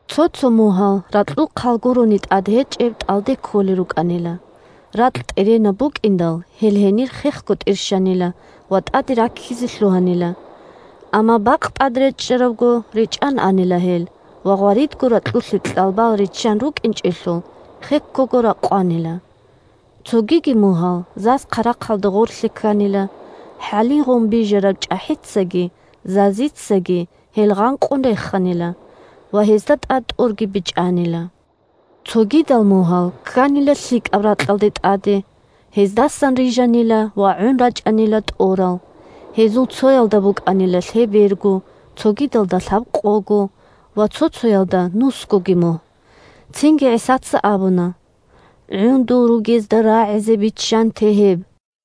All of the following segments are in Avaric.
Цо-цо мугьал ракьул хъал гурони тӀад гьечӀеб тӀалде кколел рукӀанила. Ракь тӀеренаб букӀиндал, гьел гьенир хехго тӀирщанила ва тӀаде раккизе лъугьанила. Амма бакъ тӀад речӀчӀарабго, речӀан анила гьел, ва гъваридго ракьулъе кьалбал риччан рукӀинчӀелъул, хеккого ракъванила. Цогиги мугьал заз-хъарахъалда гъорлъе кканила, хӀалигъун бижараб чӀахӀицаги зазицаги гьел гъанкъун реханила, ва гьезда тӀад тӀорги бечӀанила. Цогидал мугьал кканила лъикӀаб ракьалда тӀаде, гьездасан рижанила ва гӀун рачӀанила тӀорал: гьезул цоялда букӀанила лъеберго, цогидалда – лъабкъого ва цо-цоялда – нусгоги мугь. Цинги ГӀисаца абуна: – ГӀундул ругезда рагӀизе биччанте гьеб!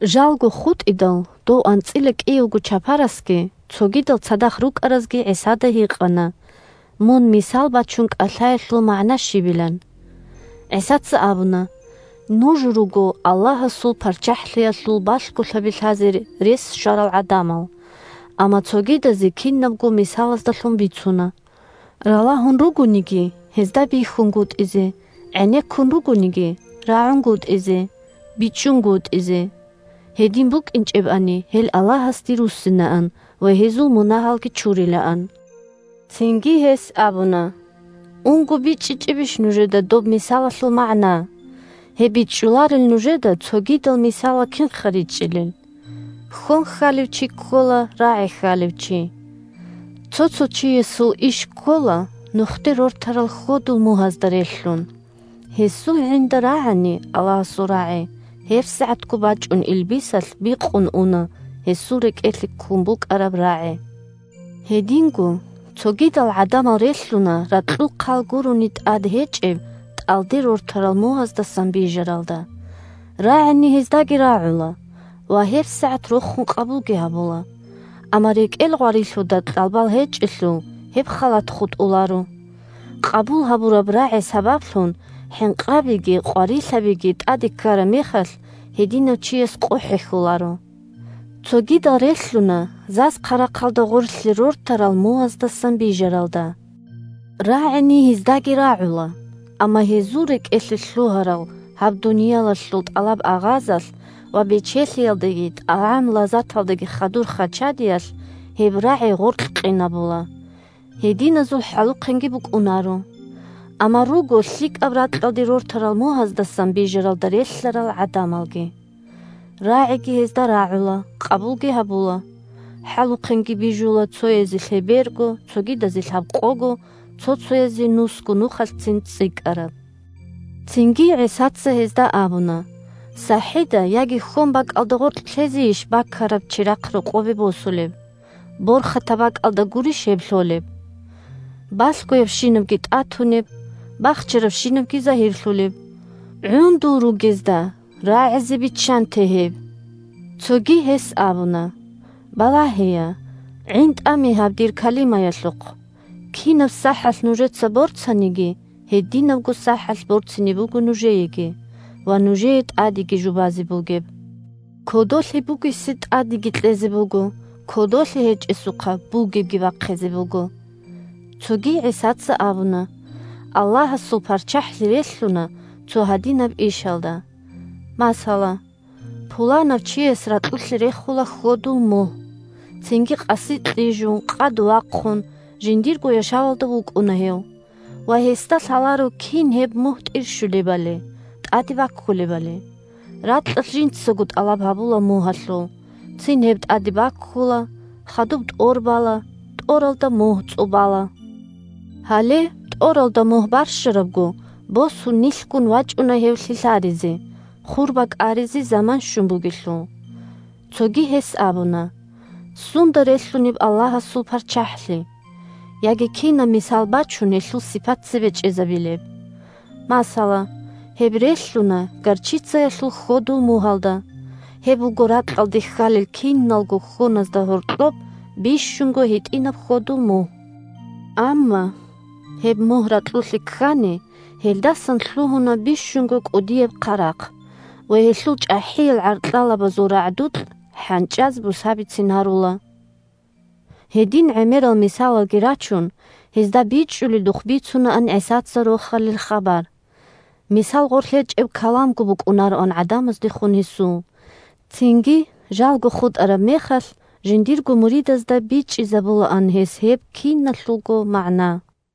Жалго хутӀидал, дов анцӀила кӀиявго чапарасги цогидал цадахъ рукӀаразги ГӀисада гьикъана, мун мисал бачун кӀалъаялъул магӀна щибилан. ГӀисаца абуна: – Нуж руго Аллагьасул ПарччахӀлъиялъул балъголъаби лъазе рес щварал гӀадамал, амма цогидазе кинабго мисалаздалъун бицуна, – ралагьун ругониги гьезда бихьунгутӀизе, гӀенеккун ругониги рагӀунгутӀизе, бичӀчӀунгутӀизе. Гьедин букӀинчӀебани, гьел Аллагьасде руссинаан ва гьезул мунагьалги чурилаан. Цинги гьес абуна: – Унго бичӀчӀичӀебищ нужеда доб мисалалъул магӀна? Гьеб бичӀчӀуларел нужеда цогидал мисалал кинха ричӀчӀилел? Хьон хьалев чи ккола рагӀи хьалев чи. Цо-цо чиясул иш ккола нухде рортарал хьодул мугьазда релълъун. Гьесул гӀинда рагӀани Аллагьасул рагӀи, гьебсагӀатго бачӀун илбисалъ бикъун уна гьесул рекӀелъе ккун букӀараб рагӀи. Гьединго цогидал гӀадамал релълъуна ракьул хъал гурони тӀад гьечӀеб тӀалде рортарал мугьаздасан бижаралда. РагӀини гьездаги рагӀула ва гьебсагӀат рохун къабулги гьабула. Амма рекӀел гъварилъуда кьалбал гьечӀелъул, гьеб халат хутӀуларо. Къабул гьабураб рагӀи сабаблъун хӀинкъабиги къварилъабиги тӀаде ккараб мехалъ, гьединав чияс къо хӀехьоларо. Цогидал релълъуна заз-хъарахъалда гъорлъе рортарал мугьаздасан бижаралда. РагӀини гьездаги рагӀула, амма гьезул рекӀелъе лъугьарал гьаб дуниялалъул тӀалаб-агъазалъ ва бечелъиялдаги тӀагӀам-лазаталдаги хадур хачадиялъ гьеб рагӀи гъоркь къинабула. Гьединазул хӀалухъенги букӀунаро. Амма руго лъикӀаб ракьалде рортарал мугьаздасан бижаралда релълъарал гӀадамалги. РагӀиги гьезда рагӀула, къабулги гьабула. ХӀалухъенги бижула цоязе лъеберго, цогидазе лъабкъого, цо-цоязе нусго нухалъцин цӀикӀкӀараб. Цинги ГӀисаца гьезда абуна: – СахӀида гъоркь яги хьонбакӀалда гъоркь лъезейищ чирахъ бакун рокъобе жанибе босулеб? Борхатаб бакӀалда гурищ гьеб лъолеб? Балъгоябщинабги тӀатунеб, бахчарабщинабги загьирлъулеб. ГӀундул ругезда рагӀизе биччанте гьеб! Цоги гьес абуна: – Балагьея, гӀинтӀаме гьаб дир калимаялъухъ: кинаб сахӀалъ нужеца борцаниги, гьединабго сахӀалъ борцине буго нужееги, ва нужее тӀадеги жубазе бугеб. Кодолъи бугесе тӀадеги кьезе буго, кодолъи гьечӀесухъа бугебги бахъизе буго. Цоги ГӀисаца абуна: – Аллагьасул ПарччахӀлъи релълъуна цо гьадинаб ишалда. Масала, пуланав чияс ракьулъе рехула хьодул мугь. Цинги къаси кьижун, къад вахъун, жиндирго яшавалда вукӀуна гьев, ва гьесда лъаларо кин гьеб мугь тӀирщулебали, тӀаде баккулебали. Ракьалъ жинцаго тӀалаб гьабула мугьалъул: цин гьеб тӀаде баккула, хадуб тӀор бала, тӀоралда мугь цӀубала. Гьале, тӀоралда мугь барщарабго, босун нилъгун вачӀуна гьев лъилъаризе, хур бакӀаризе заман щун бугелъул. Цоги гьес абуна: – Сунда релълъунеб Аллагьасул ПарччахӀлъи? Яги кинаб мисал бачун гьелъул сипат цебе чӀезабилеб? Масала, гьеб релълъуна горчицаялъул хьодул мугьалда. Гьеб буго ракьалде хьалел киналго хьоназда гьоркьоб бищунго гьитӀинаб хьодул мугь. Амма гьеб мугь ракьулъе ккани, гьелдасан лъугьуна бищунго кӀудияб хъарахъ, ва гьелъул чӀахӀиял гӀаркьалабазул рагӀдукь хӀанчӀаз бусабицин гьарула. Гьедин гӀемерал мисалалги рачун, гьезда бичӀчӀуледухъ бицунаан ГӀисаца Рохалил хабар. Мисал гъорлъ гьечӀеб каламго букӀунароан гӀадамаздехун гьесул. Цинги жалго хутӀараб мехалъ, жиндирго муридазда бичӀчӀизабулаан гьес гьеб киналъулго магӀна.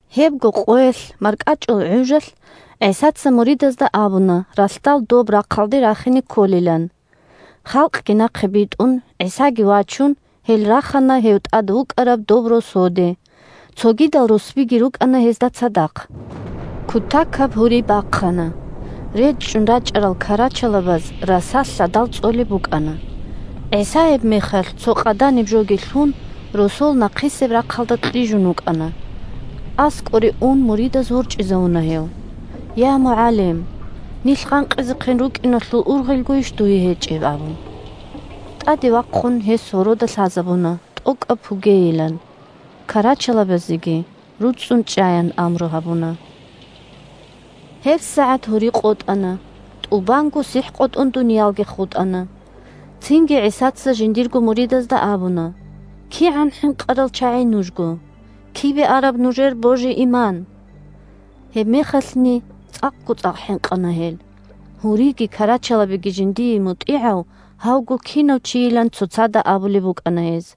Гьебго къоялъ маркӀачӀул гӀужалъ ГӀисаца муридазда абуна ралъдал доб рахъалде рахине кколилан. Халкъги нахъе битӀун, ГӀисаги вачун, гьел рахана гьев тӀад вукӀараб доб росоде. Цогидал русбиги рукӀана гьезда цадахъ. Кутакаб гьури бахъана: речӀчӀун рачӀарал карачалабаз раса лъадал цӀолеб букӀана. ГӀиса гьебмехалъ, цо къаданибжоги лъун, росол нахъисеб рахъалда кьижун вукӀана. АскӀоре ун, муридаз ворчӀизавуна гьев: – Я, МугӀалим! Нилъ гъанкъизехъин рукӀиналъул ургъелгойищ дуе гьечӀеб? – абун. ТӀаде вахъун гьес гьорода лъазабуна, тӀокӀаб пугейилан, карачалабазеги: «РуцӀцӀун чӀа!» – ян амру гьабуна. ГьебсагӀат гьури къотӀана, тӀубанго сихӀ къотӀун дуниялги хутӀана. Цинги ГӀисаца жиндирго муридазда абуна: – КигӀан хӀинкъарал чагӀи нужго! Кибе араб нужер божи-иман? Гьебмехалъни цӀакъго-цӀакъ хӀинкъана гьел, гьуриги карачалабиги жиндие мутӀигӀав гьавго кинав чийилан цоцазда абулеб букӀана гьез.